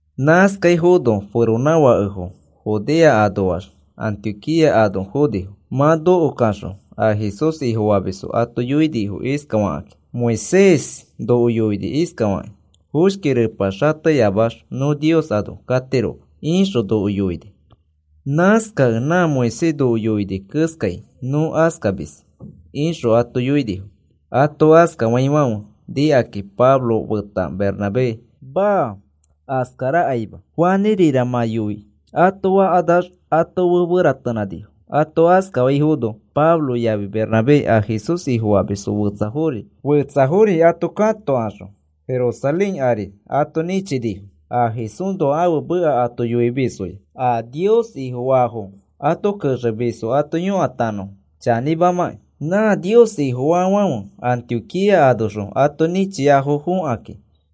Nãskaifono feronãfakefo Judea anoax Antioquía ano fonifo. Mã nokokaxõ a Jesús Ifofamisfo ato yoinifo iskafakakĩ: “Moisés noko yoini iskafakĩ: ‘Foshki repa xateyamax nõ Nios ano katiroma,’ ixõ noko yoini. Nãskakẽ nã Moisés noko yoini keskai nõ askamis,” ixõ ato yoinifo. Ato askafaifãfe nikakĩ Pablo feta Bernabé, “Maa, askarakaima. Fanĩrira mã yoi,” ato fakanax ato fe feratenãnifo. Ato askafaifono Pablo yafi Bernabé a Jesús Ifofamisfo fetsafori ato katokaxõ Jerusalén ari ato nĩchinifo a Jesúsxõ ãfe meka ato yoimisfoya a Nios Ifofaafo ato kexemisfo ato yõkatanõfo chanĩmamakĩ. Nã Nios Ifofaafãfe Antioquía anoxõ ato nĩchiafo fokakĩ,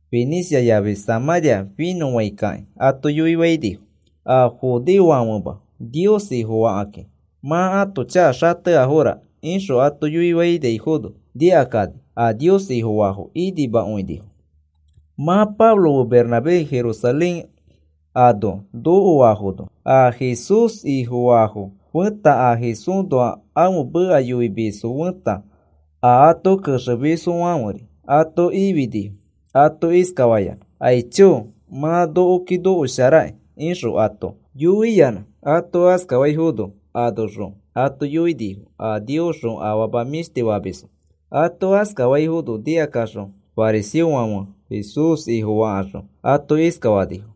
Finicia yafi Samãria finõfãikakĩ ato yoifainifo: “A judeofofãfema Nios Ifofakakĩ mã ãto chaka xateafora,” ixõ ato yoiaifono nikakani a Nios Ifofaafo inimakõinifo. Mã Pablo fe Bernabé Jerusalén ano nokoafono, a Jesús Ifofaafo feta a Jesúsxõ ãfe meka yoimisfo feta a ato kexemisfofãferi ato ifinifo, ato iskafayanã: “Aicho, mã nokoki osharakĩ,” ixõ ato yoiyanã. Ato askafaifono anoxõ ato yoinifo a Niosxõ afama mĩshtifofamisfo. Ato askafaifono nikaxõ fariseofãfe Jesús Ifofakaxõ ato iskafanifo: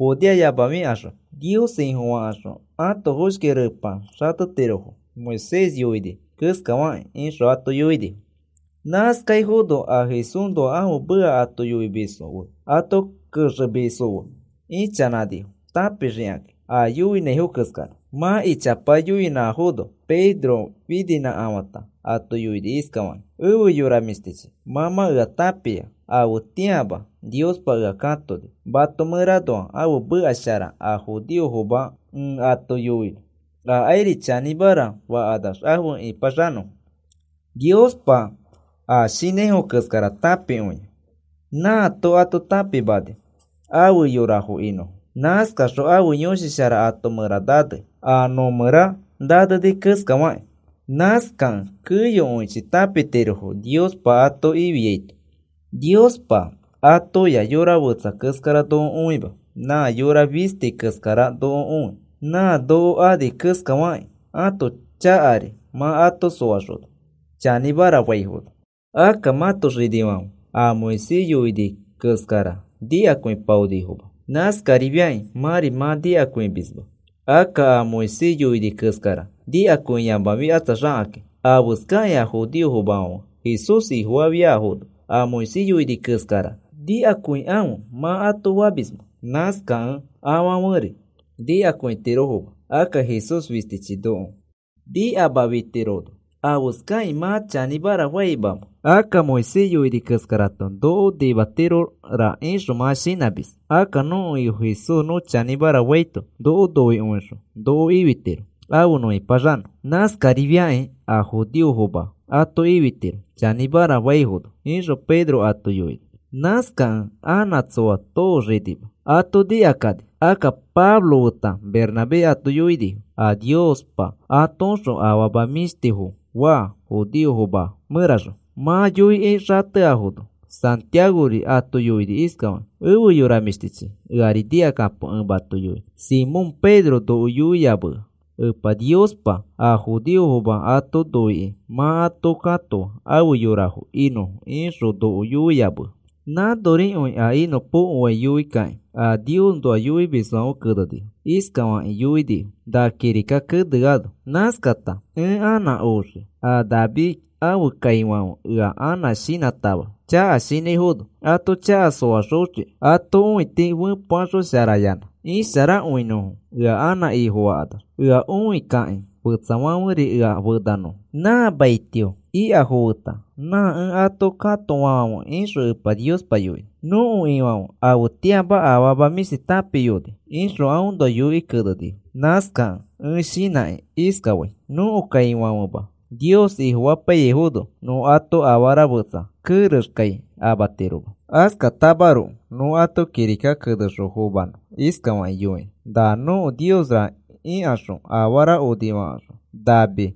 “Judeo yamafikaxõ Nios Ifofakaxõ ãto foshki repa xatetirofo Moisés yoini keskafakĩ,” ixõ ato yoinifo. Nãskaifono a Jesúsxõ ãfe meka ato yoimisfo fe ato kexemisfo fe ichanãnifo tãpixikakĩ a yoiaifo keskara. Mã ichapa yoinãfono Pedro fininãkafã ato yoini iskafakĩ: “Efe yora mĩshtichi, mã mã ea tãpia afetĩama Niospa ea katoni, mato mẽranoa ãfe meka shara a judeofoma ẽ ato yoinõ, akairi chanĩmara fakanax afe ĩpaxanõfo. Niospa a shinãifo keskara tãpikõia. Nãato ato tãpimani afe yora inõfo. Nãskaxõ ãfe Yõshi Shara ato mẽra nanei, a nõmẽra naneni keskafakĩ. Nãskakẽ keyokõichi tãpitirofo Niospa ato ifiaito. Niospa atoya yora fetsa keskara noko õima, nã yora fisti keskara noko õi. Nã noko ani keskafakĩ ãto chakari mã ato soaxona chanĩmara faifono. Akka mãto xinifãfe a Moisés yoini keskara nikakõipaonifoma. Nãskarifiakĩ mãri mã nikakõimisma. Akka a Moisés yoini keskara nikakõiyamafikatsaxakĩ, ¿afeskakĩ a judeofoma Jesús Ifofafiafono a Moisés yoini keskara nikakõikãfe mã ato famismẽ? Nãskakẽ afãferi nikakõitirofoma. Akka Jesús fistichi noko nimafitirono, ¿afeskakĩ mã chanĩmara faimamẽ? Akka Moisés yoini keskarato noko nimatirora ixõ mã shinãmis. Akka nõko Ifo Jesús nõ chanĩmara faito, noko noikõixõ noko ifitiro afe nõ ĩpaxanõ. Nãskarifiakĩ a judeofoma ato ifitiro chanĩmara faifono,” ixõ Pedro ato yoini. Nãskakẽ anã tsoa tooxinima, ato nikakani. Akka Pablo feta Bernabé ato yoinifo a Niospa atoõxõ afama mĩshtifo faa, judeofoma mẽraxõ. Mã yoikĩ xateafono, Santiagori ato yoini iskafakĩ: “Efe yora mĩshtichi, eari nikakapo ẽ mato yoinõ. Simón Pedro noko yoiyamea Epa Niospa a judeofoma ato noikĩ mã ato katoa ãfe yorafo inõfo ixõ noko yoiyamea. Nãnorikõi a inõpokoai yoikakĩ a Niosnoa yoimisfãfe kenenifo. Iskafakĩ yoinifo na kirika keneano: Nãskata ẽ anã oxii a David ãfe kaifãfe ea anã shinãtama chaka shinãifono, ato chaka soaxoxiki. Ato õiti fepeaxosharayanã isharakõinõfo ea anã Ifofakanax. Ea õikakĩ fetsafãferi ea fenanõfo nã maitio ikafo feta nã ẽ ato katoafãfe ixõ Epa Niospa yoini. Nõko Ifãfe afetĩama afama mĩshti tãpiyoni, ixõ aõnoa yoikĩ kenenifo. “Nãskakẽ ẽ shinãkĩ iskafai, nõko kaifãfema Nios Ifofapaiyaifono nõ ato afara fetsa kerexkai amatiroma. Askatamaroko nõ ato kirika kenexõ fomanõ iskafaki yoikĩ: Na nõko niosra ikaxõ afara onifakaxõ nami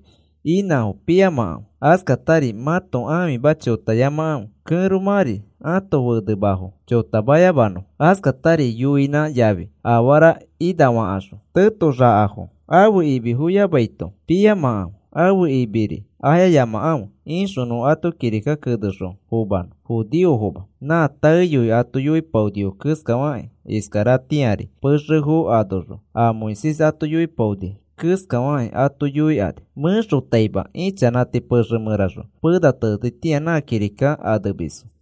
inãfo piyamakãfe. Askatari mãto ãfima chotayamakãfe. Kẽromãri ãto fenemafo chotamayamanõfo. Askatari yoinã yafi afara inafakaxõ tetoxakafo ãfe imi foyamaito piyamakãfe, ãfe imiri ayayamakãfe, ixõ nõ ato kirika kenexõ fomanõ judeofoma. Nã taeyoi ato yoipaonifo keskafakĩ, iskaratĩari pexefo anoxõ a Moisés ato yoipaoni keskafakĩ ato yoikani. Mẽxotaima ichanãti pexe mẽraxõ pena tenetitĩa nã kirika anemisfo.”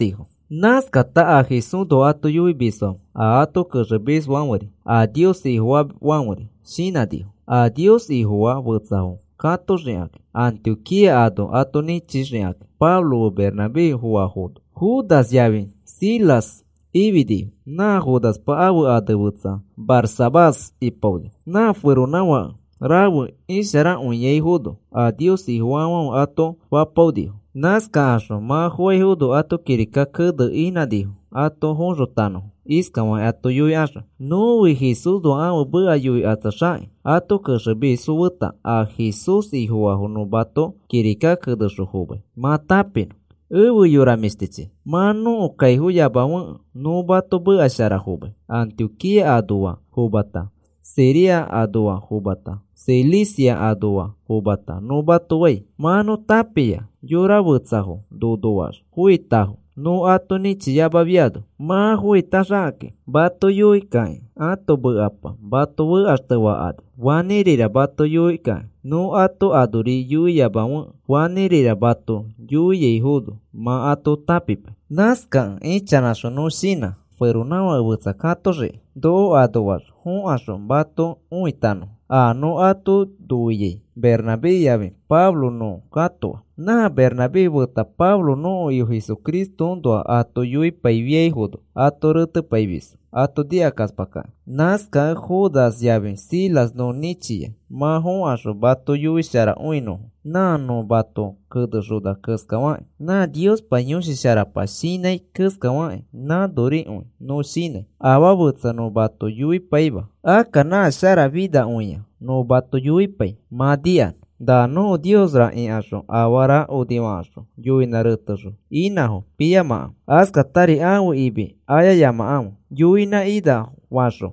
Nãskakata a Jesúsxõ ato yoimisfãfe a ato kexemisfãferi a Nios Ifofaafãferi shinãnifo a Nios Ifofaa fetsafo katoxikakĩ, Antioquía ano ato nĩchixikakĩ Pablo fe Bernabé foaifono. Judas yafi Silas ifinifo, nã Judaspa ãfe ane fetsa Barsabás ipaoni. Na feronãfake rafe isharakõiafo a Nios Ifofaafãfe ato fapaonifo. Nãskakaxõ mã foaifono ato kirika keneni inãnifo ato foxotanõfo, iskafakĩ ato yoikaxõ: Nõfi Jesúsxõ ãfe meka yoikatsaxakĩ, ato kexemisfo feta a Jesús Ifofaafo nõ mato kirika kenexõ fomai, mã tãpinõ. Efe yora mĩshtichi, mã nõko kaifoyamafekẽ nõ mato meka shara fomai, Antioquía anoa fomata Siria anoa fomata Cilicia anoa fomata nõ mato fai. Mã nõ tãpia yora fetsafo nonoax foitafo nõ ato nĩchiyamafiano, mã foitaxakakĩ mato yoikakĩ ãto mekapa mato fekaxtefakani, fanĩrira mato yoikakĩ nõ ato anori yoiyamafekẽ fanĩrira mato yoiaifono mã ato tãpipai. Nãskakẽ ichanãxõ nõ shinã feronãfake fetsafo katoxiki noko anoax fokaxõ mato õitanõfo. A nõ ato noiai Bernabé yafi Pablo nõ katoa. Nã Bernabé feta Pablo nõko Ifo Jesucristoõnoa ato yoipaifiaifono ato retepaimisfo ato nikakaspakakĩ. Nãskakẽ Judas yafi Silas nõ nĩchia mã fokaxõ mato yoisharakõinõfo nã nõ mato kenexona keskafakĩ. Nã Niospa Yõshi Sharapa shinãi keskafakĩ nãnorikõi nõ shinãi. Afaa fetsa nõ mato yoipaima. Akka nã sharafinakõia nõ mato yoipai mã nikanõ: Na nõko niosra ikaxõ afara onifakaxõ yoinã retexõ inãfo piyamakãfe. Askatari ãfe imi ayayamakãfe. Yoinã ina fakaxõ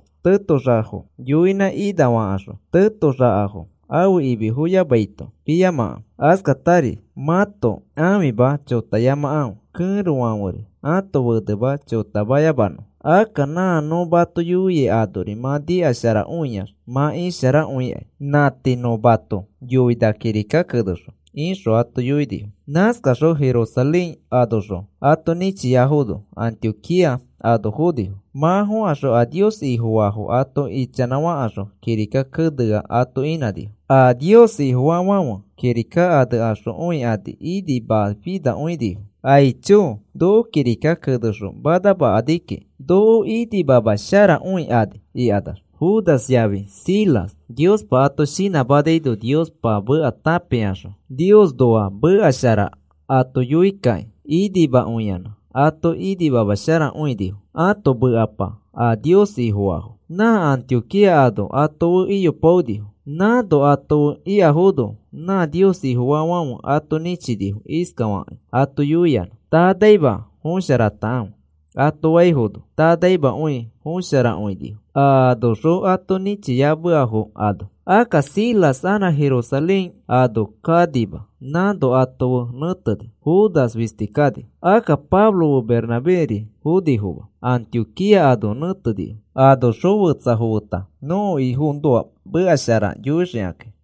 tetoxakafo ãfe imi foyamaito piyamakãfe. Askatari mãto ãfima chotayamakãfe, kẽrofãferi ãto fenema chotamayamanõfo. Akka nã nõ mato yoiai anori mã nikasharakõiax, mã isharakõikai. Nã tii nõ mato yoi na kirikaki kenexõ, ixõ ato yoinifo. Nãskakaxõ Jerusalén anoxõ ato nĩchiafono Antioquía ano fonifo. Mã fokaxõ a Nios Ifofaafo ato ichanãfakaxõ kirika kenea ato inãnifo. A Nios Ifofaafãfe kirika anexõ õikani, inimaifinakõinifo, “Aicho, noko kirika kenexõ manamakakĩ noko inimamasharakõikani,” ikanax. Judas yafi Silas Niospa ato shinãmanaino Niospa meka tãpikaxõ Niosnoa meka shara ato yoikakĩ ato inimakõiyanã ato nikamasharakõinifo ãto mekapa a Nios Ifofaafo. Nã Antioquía ano ato fe iyopaonifo. Nãno ato fe ikafono nã Nios Ifofaafãfe ato nĩchinifo iskafakĩ ato yoiyanã: “Tanaima fosharatakãfe,” ato faifono, tanaimakõi fosharakõinifo a anoxõ ato nĩchiameafo ano. Akka Silas anã Jerusalén ano kanima nãno ato fe nẽteni. Judas fisti kani. Akka Pablo fe Bernabéri fonifoma, Antioquía ano nẽtenifo anoxõ fetsafo feta nõko Ifoõnoa meka shara yoixikakĩ.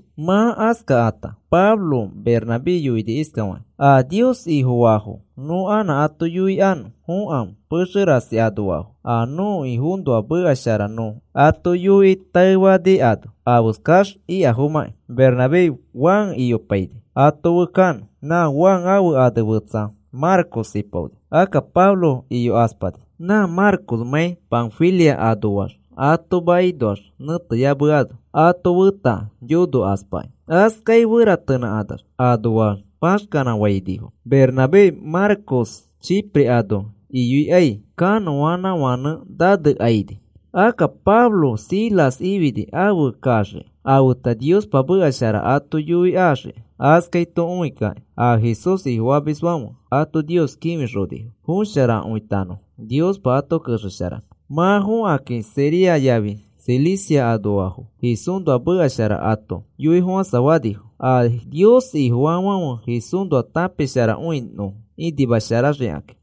Mã askakãta Pablo Bernabé yoini iskafakĩ: “A Nios Ifofaafo nõ anã ato õikanõ fokãfe pexe rasi anoafo a nõko Ifoõnoa meka shara nõ ato yoikĩ taefaniano afeskax ikafomãki.” Bernabé Juan iyopaini ato fe kanõ, nã Juan ãfe ane fetsa Marcos ipaoni. Akka Pablo iyokaspani. Nã Marcosmãi Panfilia anoax ato makinoax nẽteyameano, ato feta yonokaspakĩ. Askai feratenãkanax anoax paxkanãfainifo. Bernabé Marcos Chipre ano iyoikai kanõanãfãnẽ nanekaini. Akka Pablo Silas ifini afe kaxiki, afeta Niospa meka shara ato yoi axiki. Askaito õikakĩ a Jesús Ifofamisfãfe ato Nios kĩfixonifo fosharakõitanõfo Niospa ato kexesharanõ. Mã fokakĩ Siria yafi Cilicia anoafo Jesúsnoa meka shara ato yoifofãsafanifo, a Nios Ifofaafãfe Jesúsnoa tãpisharakõinõfo inimasharaxikakĩ.